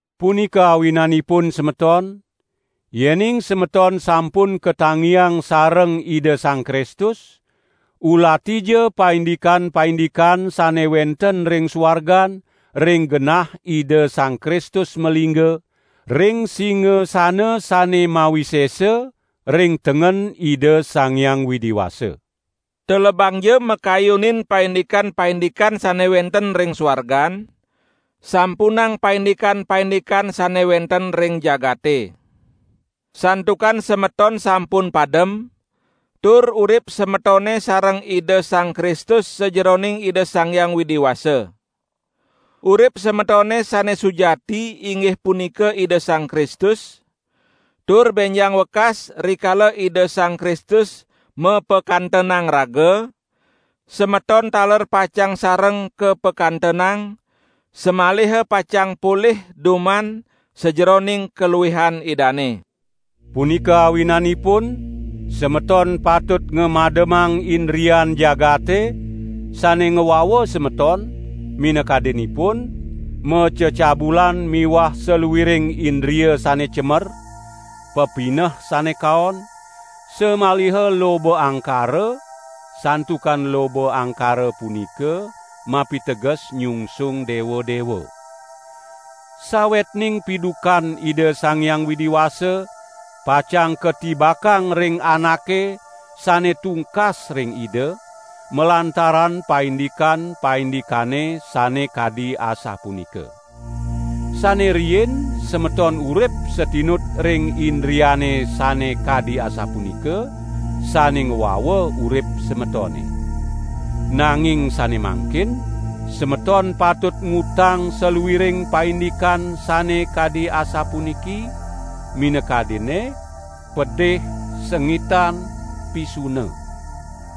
Punika awinanipun semeton, yening semeton sampun katangiang sareng Ida Sang Kristus, ulatija paindikan-paindikan sane wenten ring suargan ring genah Ida Sang Kristus malingga, ring singasana sane mawisesa ring tengen Ida Sang Hyang Widi Wasa. Telebangja makayunin paindikan-paindikan sane wenten ring suargan, sampunang paindikan-paindikan sane wenten ring jagate. Santukan semeton sampun padem, tur urip semetone sareng Ida Sang Kristus sajeroning Ida Sang Hyang Widi Wasa. Urip semetone sane sujati inggih punika Ida Sang Kristus, tur benjang wekas rikala Ida Sang Kristus mapakantenang raga, semeton taler pacang sareng kapakantenang, samaliha pacang polih duman sajeroning kaluihan Idane. Punika awinanipun semeton patut ngamademang indrian jagate, sane ngwawa semeton, minakadinipun: macecabulan miwah saluiring indria sane cemer, pepineh sane kaon, samaliha loba angkara (santukan loba angkara punika mapiteges nyungsung dewa-dewa). Sawetning pidukan Ida Sang Hyang Widi Wasa pacang katibakang ring anake sane tungkas ring Ida malantaran paindikan-paindikane sane kadi asapunika. Sane riin semeton urip satinut ring indriane sane kadi asapunika, sane ngwawa urip semetone. Nanging sane mangkin semeton patut ngutang saluiring paindikan sane kadi asapuniki, minakadinne: pedih, sengitan, pisuna.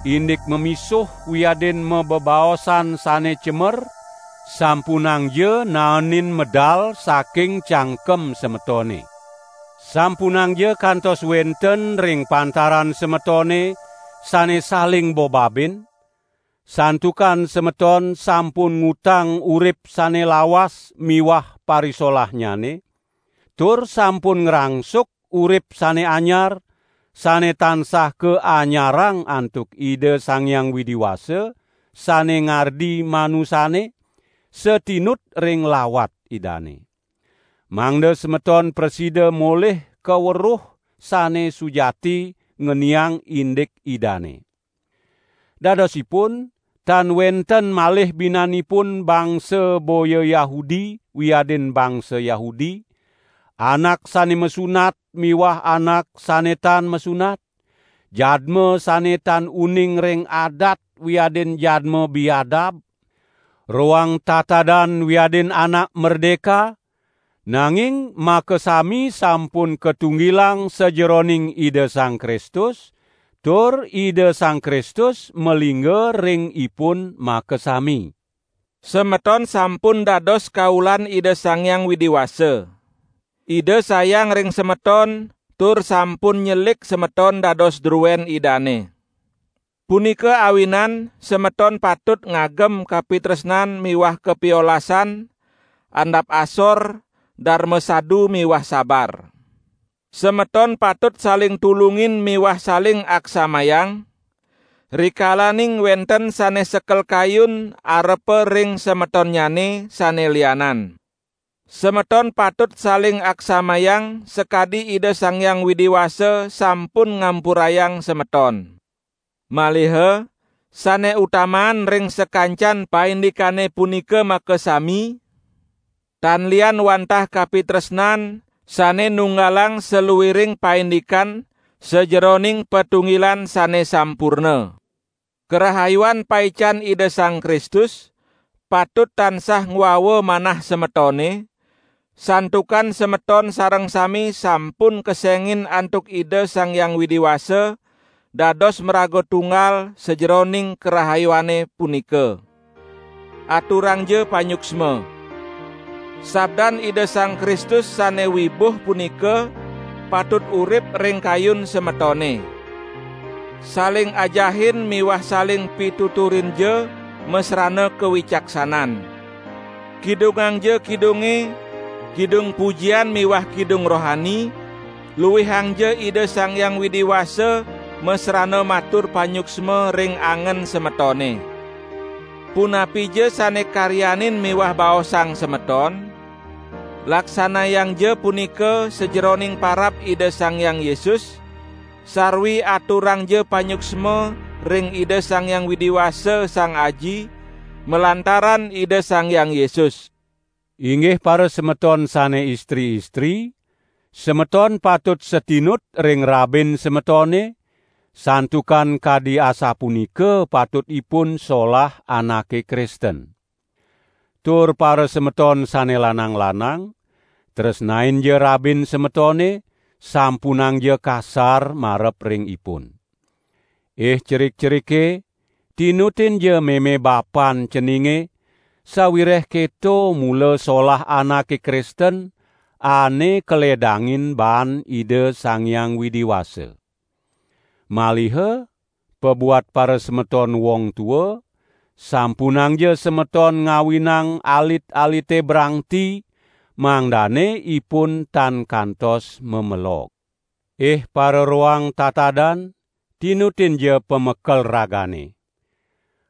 Indik mamisuh wiadin mabebaosan sane cemer, sampunangja naenin medal saking cangkem semetone. Sampunangja kantos wenten ring pantaran semetone sane saling bobabin, santukan semeton sampun ngutang urip sane lawas miwah parisolahnyane, tur sampun ngrangsuk urip sane anyar, sane tansah kaanyarang antuk Ida Sang Hyang Widi Wasa, sane ngardi manusane, satinut ring lawat Idane. Mangda semeton prasida molih kaweruh sane sujati ngeniang indik Idane. Dadosipun tan wenten malih binanipun bangsa boya Yahudi wiadin bangsa Yahudi, anak sane masunat miwah anak sane tan masunat, jadma sane tan uning ring adat wiadin jadma biadab, roang tatadan wiadin anak merdeka, nanging makasami sampun katunggilang sajeroning Ida Sang Kristus tur Ida Sang Kristus malingga ring ipun makasami. Semeton sampun dados kaulan Ida Sang Hyang Widi Wasa. Ida sayang ring semeton tur sampun nyelik semeton dados druen Idane. Punika awinan semeton patut ngagem kapitresnan miwah kapiolasan, andap asor, darma sadu miwah sabar. Semeton patut saling tulungin miwah saling aksamayang, rikalaning wenten sane sekel kayun arepa ring semetonnyane sane lianan. Semeton patut saling aksamayang sakadi Ida Sang Hyang Widi Wasa sampun ngampurayang semeton. Maliha sane utamaan ring sakancan paindikane punika makasami, tan lian wantah kapitresnan, sane nunggalang saluiring paindikan sajeroning patunggilan sane sampurna. Karahayuan paican Ida Sang Kristus, patut tansah ngwawa manah semetone, santukan semeton sareng sami sampun kesengin antuk Ida Sang Hyang Widi Wasa dados maraga tunggal sajeroning karahayuane punika. Aturangja panyuksma. Sabdan Ida Sang Kristus sane wibuh punika patut urip ring kayun semetone. Saling ajahin miwah saling pituturinja masrana kawicaksanan. Kidungangja Kidunge, kidung pujian miwah kidung rohani; luihangja Ida Sang Hyang Widi Wasa masrana matur panyuksma ring angen semetone. Punapija sane karyanin miwah baosang semeton, laksanayangja punika sajeroning parab Ida Sang Hyang Yesus, sarwi aturangja panyuksma ring Ida Sang Hyang Widi Wasa, Sang Aji, malantaran Ida Sang Hyang Yesus. Inggih parasemeton sane istri-istri, semeton patut satinut ring rabin semetone, santukan kadi asapunika patutipun solah anake Kristen. Tur parasemeton sane lanang-lanang, tresnainja rabin semetone, sampunangja kasar marep ring ipun. Ih cerik-cerike, tinutinja meme bapan ceninge, sawireh keto mula solah anake Kristen, ane kaledangin baan Ida Sang Hyang Widi Wasa. Maliha pabuat parasemeton wong tua, sampunangja semeton ngawinang alit-alite brangti, mangdane ipun tan kantos mamelog. Ih pararoang tatadan, tinutinja pamekel ragane.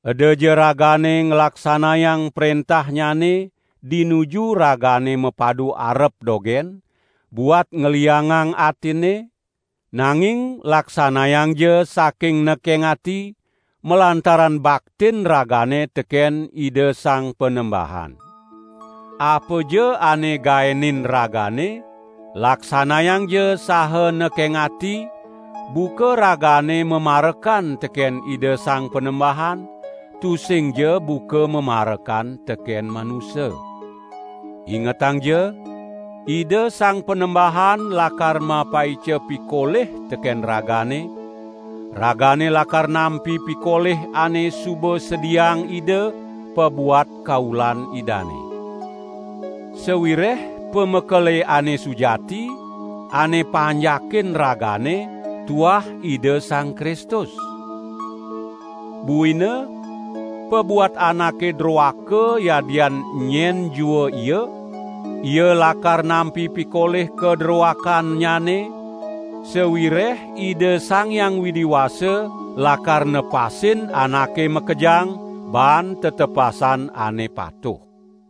Edaja ragane nglaksanayang prentahnyane dinuju ragane mapadu arep dogen, buat ngliangang atinne, nanging laksanayangja saking nekeng ati, malantaran baktin ragane teken Ida Sang Panembahan. Apaja ane gaenin ragane, laksanayangja saha nekeng ati, buka ragane mamarekan teken Ida Sang Panembahan, tusingja buka mamarekan teken manusa. Ingetangja, Ida Sang Panembahan lakar mapaica pikolih teken ragane; ragane lakar nampi pikolih ane suba sediaang Ida pabuat kaulan Idane. Sawireh pamekele ane sujati, ane panjakin ragane, tuah Ida Sang Kristus. Buina pabuat anake droaka yadian enyen jua ia, ia lakar nampi pikolih kadrowakannyane; sawireh Ida Sang Hyang Widi Wasa lakar nepasin anake makejang baan tetepasan ane patuh.